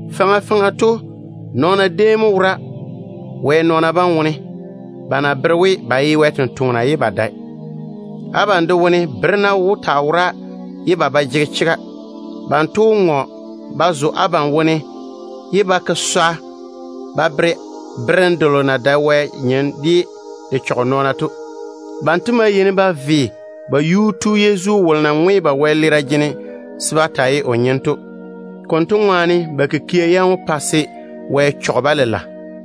Faŋa faŋa to nɔɔna déem mo wora Wɛ nɔɔna bam wone ba na bere we ba ye Wɛ sampwori ye ba dae. Abam de wone berena wó taa wora ye ba ba jege chega. Banto wó ŋɔ ba zo abam wone ye ba ke swa ba bere berem delo na dae Wɛ nyem ye de chɔge nɔɔna to. Banto maa yeini ba ve ba Yuu-tu Yezu, ye o ye wolo na ŋwe ba wɛleera jene to mo. Konto ŋwaane ba kikia yam wó pa se Wɛ chɔge-ba lela.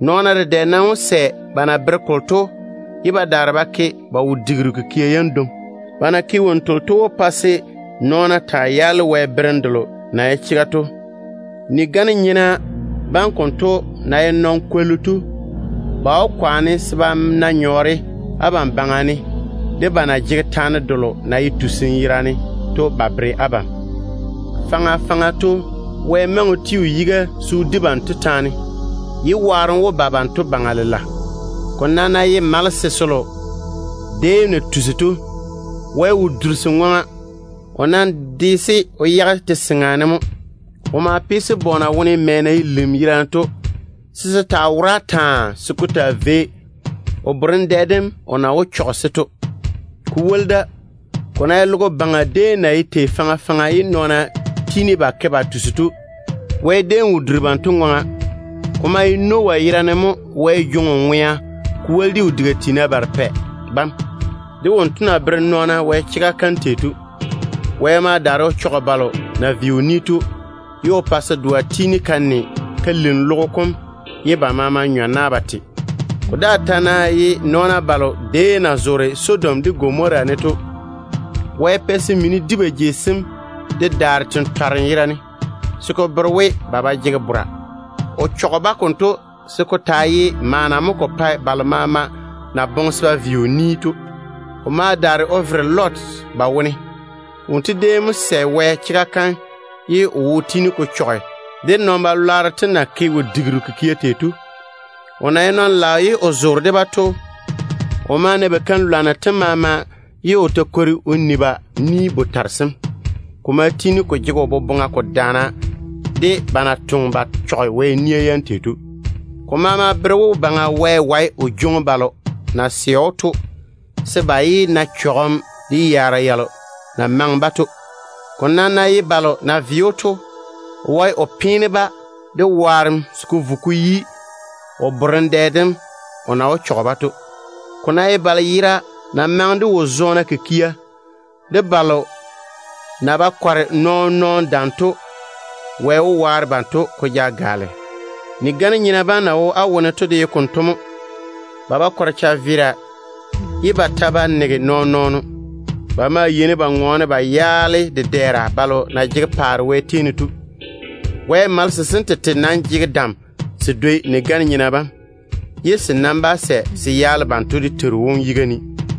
Nɔɔna dedɛ nam wó sɛ ba na bere kolo to, ye ba daare ba ke ba wo-digiru kikia yam dwoŋi. Ba na ke wonnu telo to wó pa se nɔɔna taa yaale Wɛ berem delo na ye chega to. Ni-gane-nyena bam konto na ye nɔn-kwollu to, ba wó kwaane se ba na nyɔɔre abam baŋa ne de ba na jege taane delo na ye tusim yerane to ba bere abam. Faŋa faŋa to, Wɛ maŋe o ti o yiga se o di banto taane, ye waarem wó ba ba baŋa lela. Ko nam ná ye malese selo déem na tusi to, Wɛ wo duri se ŋwaŋa. O nam de-se o yage te-seŋa ne mo. O ma pe-se bɔɔna wone mɛ na ye lim yerane to, se se taa wora taa se ko taa vei o borem dɛ dem o na wó chɔge-se to. Ko woli da, ko ná ye logo baŋa déem na ye tei faŋa faŋa ye nɔɔna ve Wɛ to, Wɛ déem wo duri banto ŋwaŋa. Ko maa ye Noah yerane mo Wɛ jwoŋi o ŋwea, ko woli de o diga tiina barepɛ bam, de wonto na tɔɔle Wɛ chega kam o bere nɔɔna tei to. Wɛ ma daare o chɔge balo na ve o ni to, ye o pa se doa tiini ka ne ka lim logo kom ye ba maama nyɔ na ba te. Ko daa ta ná ye nɔɔna balo déem na zoore Sodom de Gomora ne to, Wɛ pɛ se mini di ba jei sem de daare tentwarem yerane, se ko bere we ba ba jege bora. O chɔge-ba konto se ko taa ye maana mo ko pae balo maama na boŋe se ba ve o ni to. O ma daare o vere Lot ba wone o yage. Wonto déem mo sɛ Wɛ chega kam ye o wo tiini ko chɔge de puseŋ-nyena na ke wo-digiru kikia tei to. O na ye nɔn-ŋom ye o zoore de-ba to, o ma na ba keim-lwanno tem maama ye o ta kwori o ni ba ni-botare sem. Ko maa tiini ko jege o boboŋa ko daana de ba na toŋe ba chɔge Wɛ nia yam tei to. Ko maama bere we, Baŋa Wɛ wae o jwoŋi balo na sɛ‑o to o yage se ba yé na cham delo na maŋe-ba to. Ko nam ná ye balo na ve‑o to, o wae o peene-ba de waarem se ko vo ko yi o borem dɛ dem o na wó chɔge-ba de wone to. Ko ta ná ye balo yera na maŋe de wo-zɔɔna kikia, de balo na ba kɔre nɔɔn-nɔɔno dam to, Wɛ wó waare banto ko ja gaale. Ni-gane-nyena bam na wo á wone to de ye konto mo. Ba ba kɔre chaveera ye ba ta ba nege nɔɔn-nɔɔno. Ba maa yeini ba ŋɔɔne ba yaale dedɛɛra balo na jege paare Wɛ tei ne to. Wɛ malese sem tete nam jege dam se dwoi ni-gane-nyena bam, ye se nam ba sɛ se ŋɔɔne se yaale wɛyuu dedɛɛra bam dé Teiru wom yiga ne.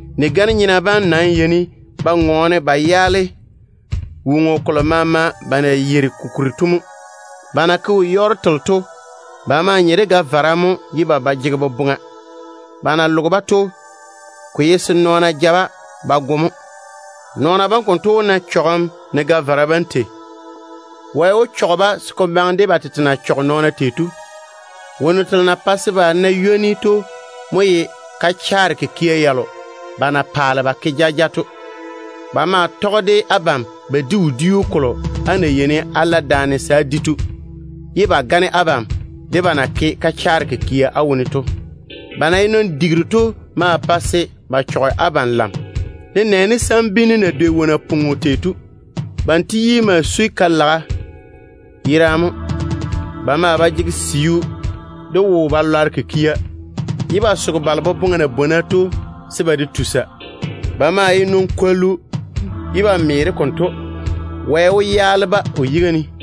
Ni-gane-nyena bam nam yeini ba ŋɔɔne ba yaale woŋo kolo maama ba na yeiri ko kuri to mo. Ba na ke wo-yɔɔro telo to, ba maa nye de ga-vara mo ye ba ba jege boboŋa. Ba na loge-ba to, ko ye se nɔɔna ja-ba ba go mo. Nɔɔna bam konto wó na chɔgem ne ga-vara bam tei. Wɛ wó chɔge-ba se ko maŋe de ba tete na chɔge nɔɔna tei to. Wonnu telo na pae se ba na ywoni to mo ye kachaare kikia yalo ba na paale ba ke jaja to. Ba maa tɔge de abam ba di wodiu kolo á na yeini á la daane se á di to, ye ba gane abam de ba na ke kachaare kikia á wone to. Ba na ye nɔn-digiru to ma pae se ba chɔge abam lam, nenɛɛne sambinnu na dwei wo-napwoŋo tei to. Banto yi maa sui ka-laga yerane mo. Ba maa ba jege siu de wo-balwaaro kikia, ye ba soge balo boboŋa na bwona to se ba de tusa. Ba maa ye nɔn-kwollu ye ba me de konto. Wɛ wó sɔɔle lwarem o yage ba yuu ne.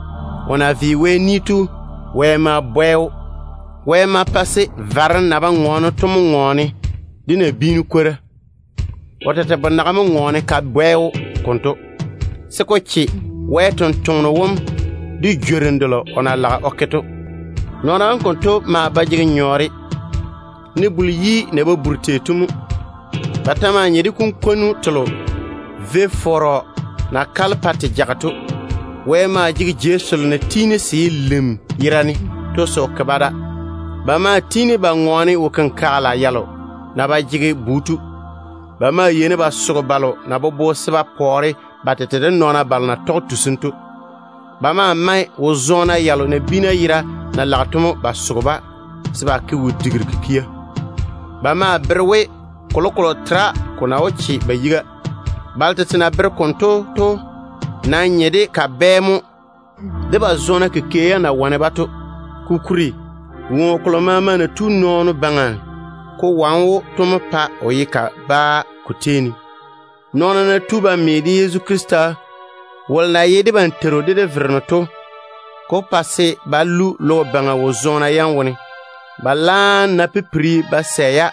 O na ve Wɛ ni to, Wɛ ma bwɛ‑o. Wɛ ma pa se varem na ba ŋɔɔne to mo ŋɔɔne de nabiinu kwora. O tete bonaga mo ŋɔɔne ka bwɛ‑o konto, se ko che Wɛ sampwora kam de jworim delo o na boŋe se o ke to. Nɔɔna bam konto maa ba jege nyɔɔre, ne buli-yi delo na na ba buri tei to mo. Ba ta maa nye de kunkwonnu telo vo-fɔrɔ na kale pa te jage to. Wɛ maa jege jei selo na tiini se ye lim yerane to se o ke-ba da. Ba maa tiini ba ŋɔɔne wo-kenkagela yalo na ba jege bu to. Ba maa yeini ba soge balo na bobo se ba pɔɔre ba tete de nɔɔna balo na tɔge tusim to. Ba maa mae wo-zɔɔna yalo nabiina yera na lage to mo ba soge-ba se ba ke wo-digiru kikia. Ba maa bere we kolokolo tera ko na wó che ba yiga. Balo tete na bere konto to nam nye de kabɛ mo, ba totoŋ-zɔɔna yam na wane-ba to ŋwaane. Kokuri, woŋo kolo maama na tu nɔɔno baŋa ko wane‑o to mo pae o ye kabaa ko tei ne. Nɔɔna ná tu ba lɔre Yezu Krista wolo na ye debam Teiru de de Vereno to chega kam, ko wó pa se ba lu logo baŋa wo-zɔɔna yam wone. Ba laam ná pipiri ba sɛ-ya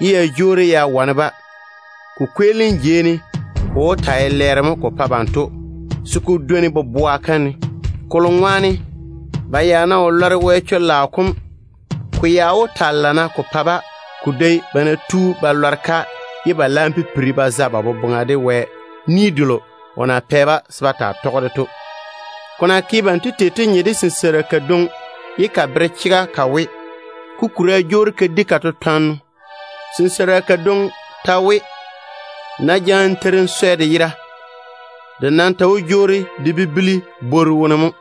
ye ya jwoori ya wane-ba, ko kweelim jei ne ko wó taa ye lɛɛro mo ko pa banto se ko dwoni boboa kam ne. Kolo ŋwaane, ba ya ná wo lɔre Wɛ chega tɔgem chwoŋa kam, ko ya wó taa lana ko pa-ba ko dwoi ba ná tu ba lɔre-ka ye ba laam pipiri ba za ba boboŋa de Wɛ ni delo o na pɛ-ba se ba taa tɔge to. Ko na ke banto tei to nye de sinseira kadwoŋi ye ka bere chega ka we: “Kukura jwoori ka di ka tetwanno.” Sinseira kadwoŋi ta we: “Nmo ná jaane teiri n swɛ de yera, de nam ta wó jwoori de bibili bworu wone mo.”